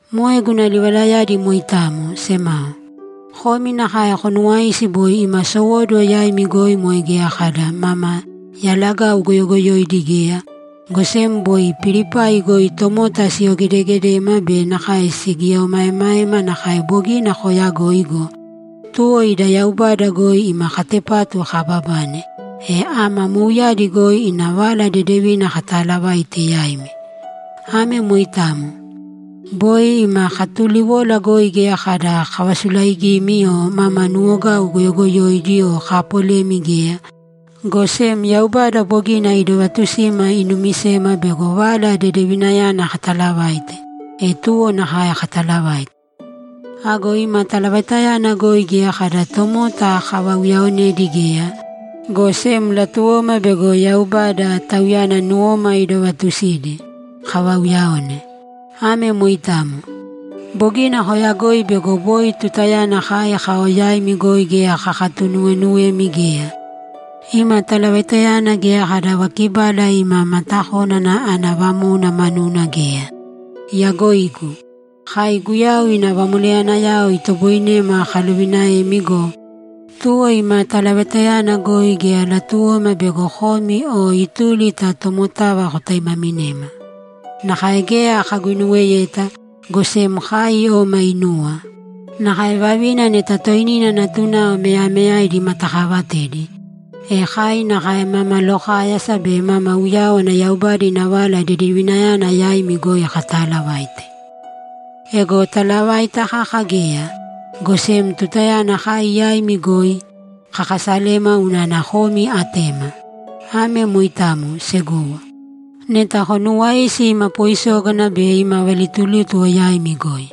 Moe guna livalayadi moitamo, semao. Komi nakae konuwaisi boi ima sowóduwo yaimi goi moe geya kada mama yalagau goyogoyoidi geya, go sem boi Pilipai goi tomota siyogedeegedema be nakae sigieomaeemaema nakae bogina kooyagoi go, tuwo ida Yaubada goi ima katepatu kaababane, e ama mouyadi goi ina Vala Dedevina katalavaite yaimi. Ame moitamo. Boi ima katuliwola goi geya kada kavasulaigimi o mama nuwogau goyogoyoidi o kaapolemi geya, go sem Yaubada bogina idovatusima inumisema bego Vala Dedevinayana katalavaite, e tuwo nakae katalavaite. Ago ima talavaitayana goi geya kada tomota kavauyaonedi geya, go sem latuwoma bego Yaubada, Tauyana nuwoma idovaatusidi, kavauyaone. Ame moitamo. Bogina koyagoi bego boi tutayana kai kao yaimi goi geya kakatunuweenuwemi geya. Ima talavaitayana geya kada vakibala ima matakónana ana vamóuna manuna geya. Iyagoigu! Kai Guyau ina vamoleyanayao itoboinema kalovinaemi go, tuwo ima talavaitayana goi geya latuwoma bego komi o ituli ta tomotava kotaimaminema. Nakae geya kaguinuweyeta, go sem kai oma inuwa; nakae vavina neta toinina natunao meyameyaidi imatakaavatedi, e kai nakae mama lokáyasa be mama uyáwana Yaubada ina Vala Dedevinayana yaimi goi kataalavaite. Ego talavaita kaka geya, go sem tutayana kai yaimi goi, kakasalema unana komi atema. Ame moitamo, segowo. Neta konuuwaisi ima poisógana be ima valitulítuwo yaimi goi.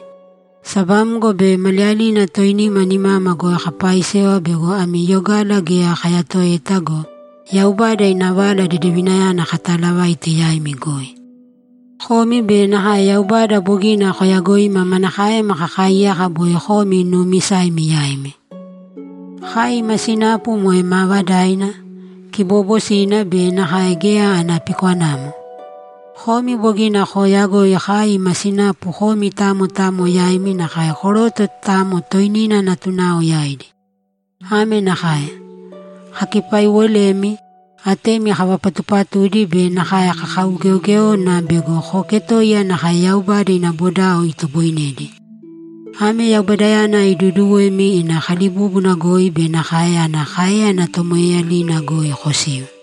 Sabamgo be maliyalina toinima nimama goi kapaaisewa bego ami yogala geya kayatoeta go, Yaubada ina Vala Dedevinayana katalavaite yaimi goi. Komi be nakae Yaubada bogina koyagoima manakaema kakaaiyaka boi komi nuumisaimi yaimi. Kai ima sinapu moe maavadaina, kiboobosina be nakae geya ana pikwanamo. Komi bogina kooyagoi kai ima sinapu komi tamo tamo yaimi nakae koroto tamo toinina natunao yaidi. Ame nakae: Kakipaiiwolemi, atemi kavapatuupatudi be nakae kakaugeogéona bego kooketoiya nakae Yaubada ina bodao itoboinedi. Ame Yaubadayana iduuduwemi ina kalibúbuna goi be nakae ana káeyana tomoeeyalina goi kosiu.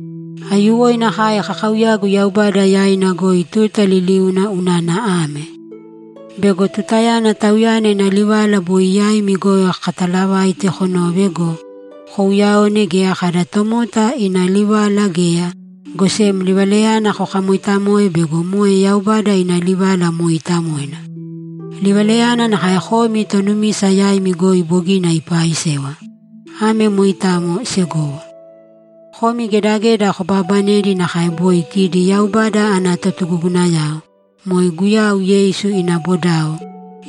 Aiyuwoina kai kakaauyagu Yaubada yaina goi tuta liliuna unana ame: Bego tutayana Tauyana ina livala boi yaimi goi kataalavaite konove go, kouyaone geya kada tomota ina livala geya, go sem livalayana kokamoitamoe bego moe Yaubada ina livala mooitamoina. Livalayana nakae komi tonumisa yaimi goi bogina ipaaisewa. Ame moitamo, segowo. Komi gedageda kobaabanedi nakae boi kidi Yaubada ana totugugunayao, moe Guyau Yeisu ina bodao,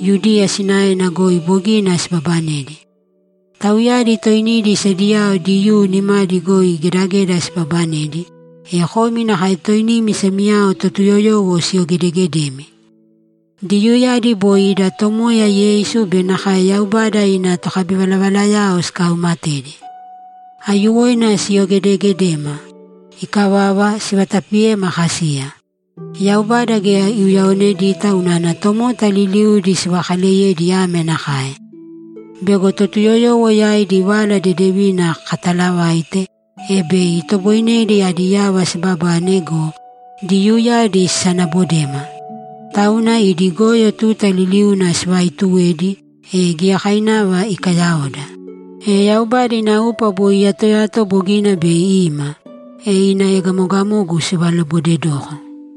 Yudiya sinaena goi bogina sibabanedi. Tauyadi toinidi sediyao Diyuu nimadi goi gedageda sibabanedi, e komi nakae toinimi semiyao Totuyoyowo siyogedegedemi. Diyuuyadi boi ida Tomoya Yeisu be nakae Yaubada ina tokabivalavalayao sikauumatedi. Aiyuwoina siyogedegedema. Ikavava, sivatapiyema kasiya. Yaubada geya iuyaonedita unana tomota liliudi sivakaleyedi ame nakae: Bego Totuyoyowo yaidi Vala Dedevina katalavaite, e bei itoboinedi adi yava sibabane go, Diyuuyadi sisanabodema. Tauna idi goyo tuta liliuna sivaaituwedi, e giyakainava ikayaoda. E Yaubada ina upa boi iyatoyato bogina bei ima, e ina egamogamogu sivalobodedoko.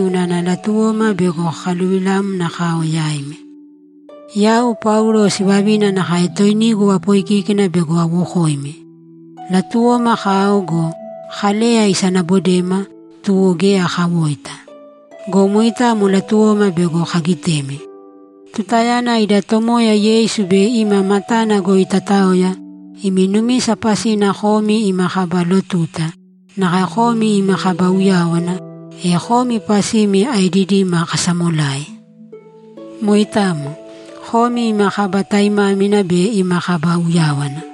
unana latuwoma bego kakaluvilamna kao yaimi. Yau Paulo sivavina nakae toinigu apoikíkina bego awokoimi! Latuwoma kao go, Kaleya isanabodema, tuwo geya kawoita. Go moitamo latuwoma bego kagitemi. Tutayana ida Tomoya Yeisu bei ima matana goi tataoya, imi numisa pasina komi ima kaba lotuta, nakae komi ima kaba uyáwana, e komi pasimi aedidima kasamolai! Moitamo. Komi ima kaba taimámina be ima kaba uyáwana!